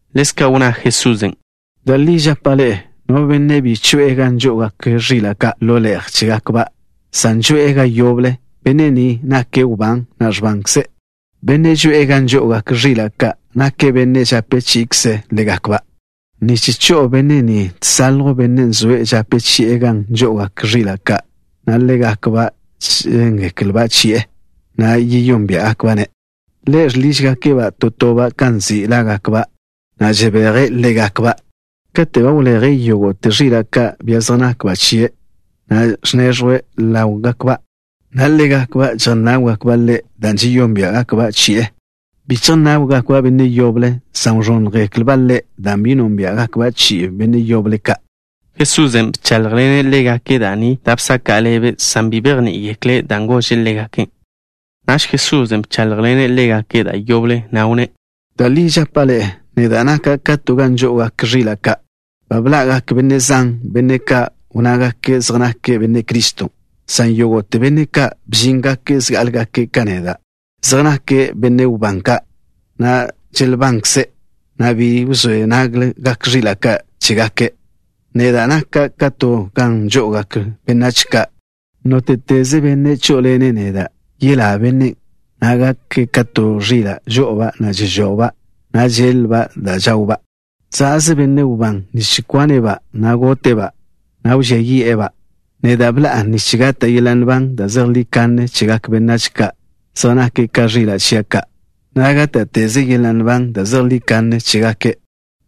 Ḻezka' wnná Jesusen': —Da' li žapa' ḻe'e: no benne' bi choe'e gan žo'ogak ẕila' ka' ḻo le'je chégakba', san žoe'e ga yoble, benne' ni nake' wbán, na' ẕbankze'. Bennen' žoe'e gan žo'ogak ẕila' ka' nake' benne' žape chi'ikze' ḻégakba'. Nich cho'o benne' ni, žsaljw benne' zoe' žape chi'e gan žo'ogak ẕila' ka', na' ḻégakba' žéngeklba' chi'e, na' žeyónbia'gakba'-ne'. Ḻe' žḻižgake'-ba' to toba' kan nzi' lágakba', na' žebeje' ḻégakba'. Kate' ba wleje' yógo'te ẕila' ka', bia zej nakba' chie', ẕnežwe' ḻáwgakba', na' ḻégakba' žejnáwgakba' ḻe', dan' žeyónbia'gakba' chi'e. Bi chejnáwgakba' benne' yoble, san wẕónnjgeklba' ḻe', dan' bi nónbia'gakba' chi'igak benne' yoble ka'. Jesusen' bcháḻjḻene' ḻégake' da' ni da' bsaka' ḻebe', san bi bejní'igekle' dan' gože' ḻégake'. Naž Jesusen' bcháḻjḻene' ḻégake' da' yoble, na' wnné': —Da' li žapa' ḻe'e: neda' naka' ka to gan žo'ogak ẕila' ka'. Ba bḻa'gak benne' zan, benne' ka' wnnágake' zej nake' Benne' Criston', san yógo'te benne' ka' bžíngake' zgá'alegake' ka neda', zej nake' benne' wbán ka', na' želbankze', na' bi wzé naggak ẕila' ka' chégake'. Neda' naka' ka to gan žo'ogak benách ka'. Nóte'teze benne' chó'oḻene' neda', yelá bennen', na' gake' ka to ẕila' žo'oba', na' žežojba', na' žéḻ-lba' da' žawba'. ’Za'ze benne' wbán nich kwane'-ba', na' gote'-ba', na' wžía yi'e-ba'. Neda' bḻa'a nich gata' yeḻa' nban da' zejlí kanne chegak benách ka' zej nake' ka ẕila' chia' ka', na' gáta'teze yeḻa' nban da' zejlí kanne chégake'.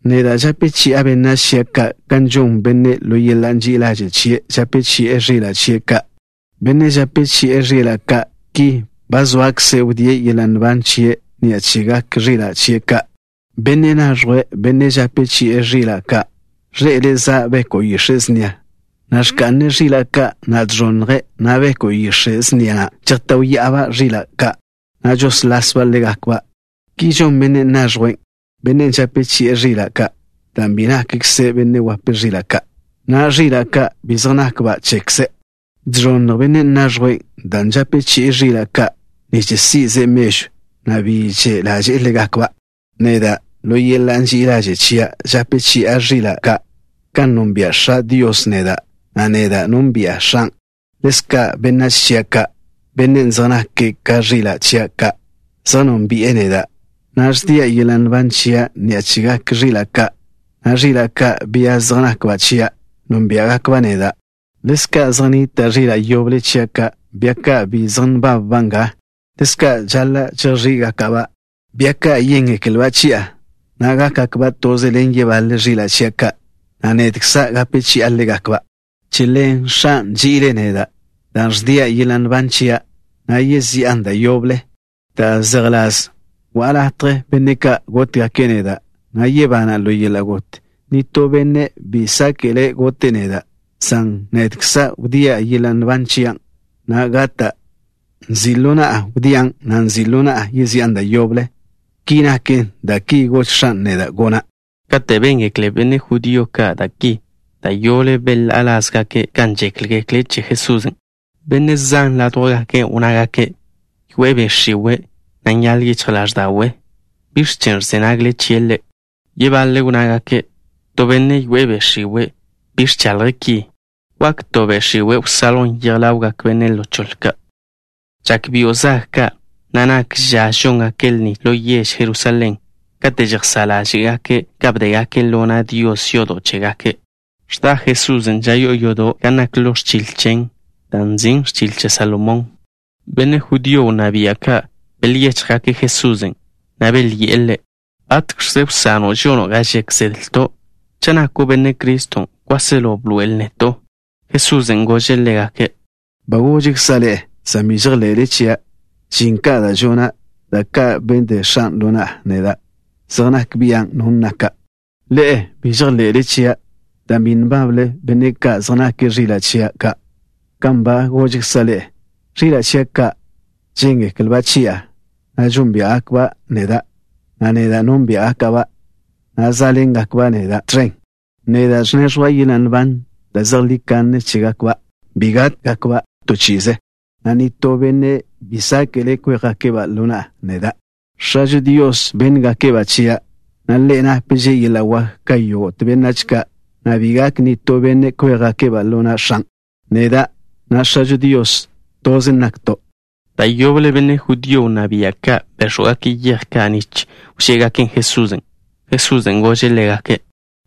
Neda' žape chi'a benách chia' ka' kan žon bennen', ḻo yeḻa' ži'i ḻaže' chie' žape chi'e ẕila' chie' ka'. Bennen' žape chi'e ẕila' ka' ki ba zoakze' wdíe' yeḻa' nban chie' ni'a chegak ẕila' chie' ka'. Benne' naẕjwe', benne' žape chi'e ẕila' ka', ẕḻe'ele' za' beko' yix̱e' snia, na' ẕka'ne' ẕila' ka', na' žẕonnje', na' beko' yix̱e' snia na' žejtáwya'aba' ẕila' ka', na' žesḻásba' ḻégakba'. Ki žon benne' naẕjwen', benne' žape chi'e ẕila' ka', dan' bi nakkze' benne' wape ẕila' ka', na' ẕila' ka' bi zej nakba' chekze'. Žẕonnj benne' naẕjwen' dan' žape chi'e ẕila' ka' nich si'ze' mežw, na' bi že' ḻaže'e ḻégakba'. ’Neda', ḻo yeḻa' ži'i ḻaže' chia' žape chi'a ẕila' ka'. Kan nonbia' X̱ažo Dios neda', na' neda' nónbi'a X̱an', ḻezka' benách chia' ka', benne' zej nake' ka ẕila' chia' ka', zej nónbi'e neda', na' ẕdia' yeḻa' nban chia' ni'a chegak ẕila' ka', na' ẕila' ka', bia zej nakba' chia' nónbia'gakba' neda'. Ḻezka' zej nnita' ẕila' yoble chia' ka', bia ka' bi zej nbabba' nga. Lezka' žaḻa' chejx̱í'gaka'-ba'. Bia ka' yéngeklba' chi'a, na' gákgakba' toze ḻen yebaḻe ẕila' chia' ka', na' nedkza' gape chi'a ḻégakba'. ’Che ḻen X̱an' nži'ile' neda', dan' ẕdia' yeḻa' nban chia', na' yezi'an da' yoble, da' zejḻás: wa'a latje benne' ka' gótgake' neda', na' yebana' ḻo yeḻa' got. Nitó benne' bi sáke'le' gote' neda', san nedkza' ẕdia' yeḻa' nban chia', na' gata'. Nzi' ḻo na'a wdían', na' nzi' ḻo na'a yezi'an da' yoble. Ki naken dan' ki gož X̱an' neda' gona'. Kate' béngekle benne' judío ka' da' ki, da' yoble bel-ḻá'a lázgake' kan žékgekle' che Jesusen'. Benne' zan ládjwgake' wnnágake': —Yoe'e be' x̱iwe', na' nyaḻ yichj ḻáẕda'we'. ¿Biẕ chen' ẕze nagle chie' Ḻe'? Yebaḻe' wnnágake': —To benne' yoe'e be' x̱iwe' bi ẕchaḻje' ki. ¿Wak to be' x̱iwe' wsaljwn yej ḻawgak benne' ḻo choḻe ka'? Žak byo' zag ka', na' nak ža žóngake' lni ḻo yež Jerusalén, kate' žejsá' ḻáže'gake' ka bdégake' yodo' chégake' ḻo na' Dios. Ẕda Jesusen' ža yo'o yodo' gan nak ḻo ẕchil chen, dan' nzin' Ẕchil Che Salomón. Benne' judío wnná bia' ka' bel-yéchjgake' Jesusen', na' belyi'e Ḻe': —¿Batx̱kze wsano' žono' ga žek zedlto'? Cha' nako' Benne' Criston', kwáselo bḻoe'el neto'. Jesusen' gože' ḻégake': —Ba gožkza' ḻe'e, san bi žejḻe'le chia'. Žin ka' da' žona', da' ka' bde X̱a' ḻo na'a gona', zej nak bian' no naka'. Ḻe'e bi žejḻe'le chia', dan' bi nbábḻenle benne' ka' zej nake' ẕila' chia' ka', kan ba gožkza' ḻe'e. Ẕila' chia' ka' žéngeklba' chi'a, na' žeyónbia'gakba' neda', na' neda' nónbia'gaka'-ba', na' zá'ḻengakba' neda' tẕen. Neda' ẕneẕjwa' yeḻa' nban da' zejlí kanne chégakba', na' bi kwia yí'gakba', na' nitó benne' bi sáke'le' kwéjgake'-ba' ḻo na'a neda'. X̱ažo Dios bénngake'-ba' chia', na' Ḻe' napže' yeḻa' wak ka yógo'te benách ka', na' bi gak nitó benne' kwéjgake'-ba' ḻo na' X̱an'. Neda', na' X̱ažo Dios, toze nakto'. Da' yoble benne' judío wnná bia' ka' béx̱wgake' yej ka' nich wžé'egaken' Jesusen'. Jesusen' gože' ḻégake':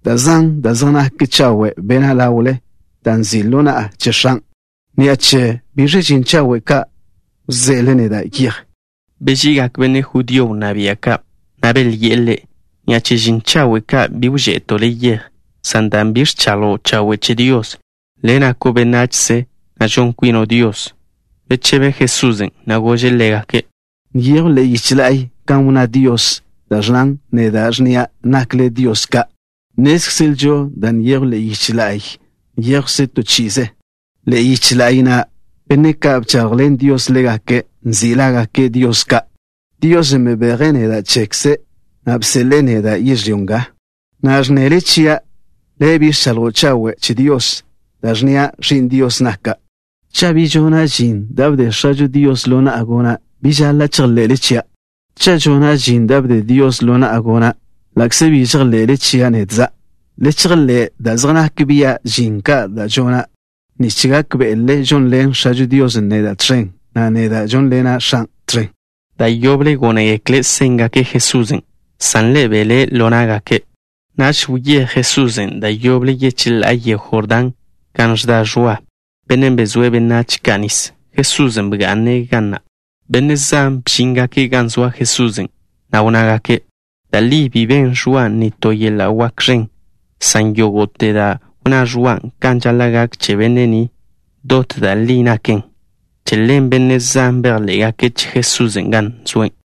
—Da' zan da' zej naken chawe' bena' ḻawle, dan' nzi' ḻo na'a che X̱an'. ¿Ni'a che biẕle žin chawe' ka' wže'ele neda' yej? Beži'igak benne' judío wnná bia' ka', na' belyi'e Ḻe': —Ni'a che žin chawe' ka' bi wže'eto' le' yej, san dan' bi ẕchaḻjo' chawe' che Dios. Le' nako' benachze, na' žon kwino' Dios. Bechebe Jesusen', na' gože' ḻégake': —Nyejw ḻe'e yiche la'y kan wnná Dios, da' ẕnnan: “Neda' ẕnnia': nakle dios ka'.” Nnézkzelžo da' nyejw ḻe'e yiche la'y nyéjwkzen to chi'ize. Ḻe'e yiche la'y na' benne' ka' bchaḻjḻen Dios ḻégake' nzi' lágake' dios ka'. Diosen' bebeje' neda' chekze', na' bseḻe'e neda' yežlyó nga. ¿Na'a ẕnnele chia': “Le' bi ẕchaḻjo' chawe' che Dios” dan' wnnía': “Ẕi'n Dios naka'”? Cha' bi žona' žin da' bde X̱ažo Dios ḻo na'a gona', bi žaḻa' chejḻe'le chia'. Cha' žona' žin da' bde Dios ḻo na'a gona', ḻa'kze bi žejḻe'le chia' nedkza', le chejḻé' da' zej nak bia' žin ka' da' žona', nich gákbe'le žonḻen X̱ažo Dios neda' tẕen, na' neda' žónḻena' X̱an' tẕen. Da' yoble gónegekle' séngake' Jesusen', san Ḻe' belé' ḻo ná'gake'. Naž wyéj Jesusen' da' yoble yecheḻá'a yego Jordán, gan wdá Ẕwa, bennen' bezóe' benách ka' nis. Jesusen' bga'ne' ga na'. Benne' zan bžíngake' gan zoa Jesusen', na' wnnágake': —Da' li bi ben Ẕwa nitó yeḻa' wak ẕen, san yógo'te da' wnná Ẕwan' kan žaḻa' gak che benne' ni, dot da' li naken. Che ḻen benne' zan bejḻé'gake' che Jesusen' gan zoe'.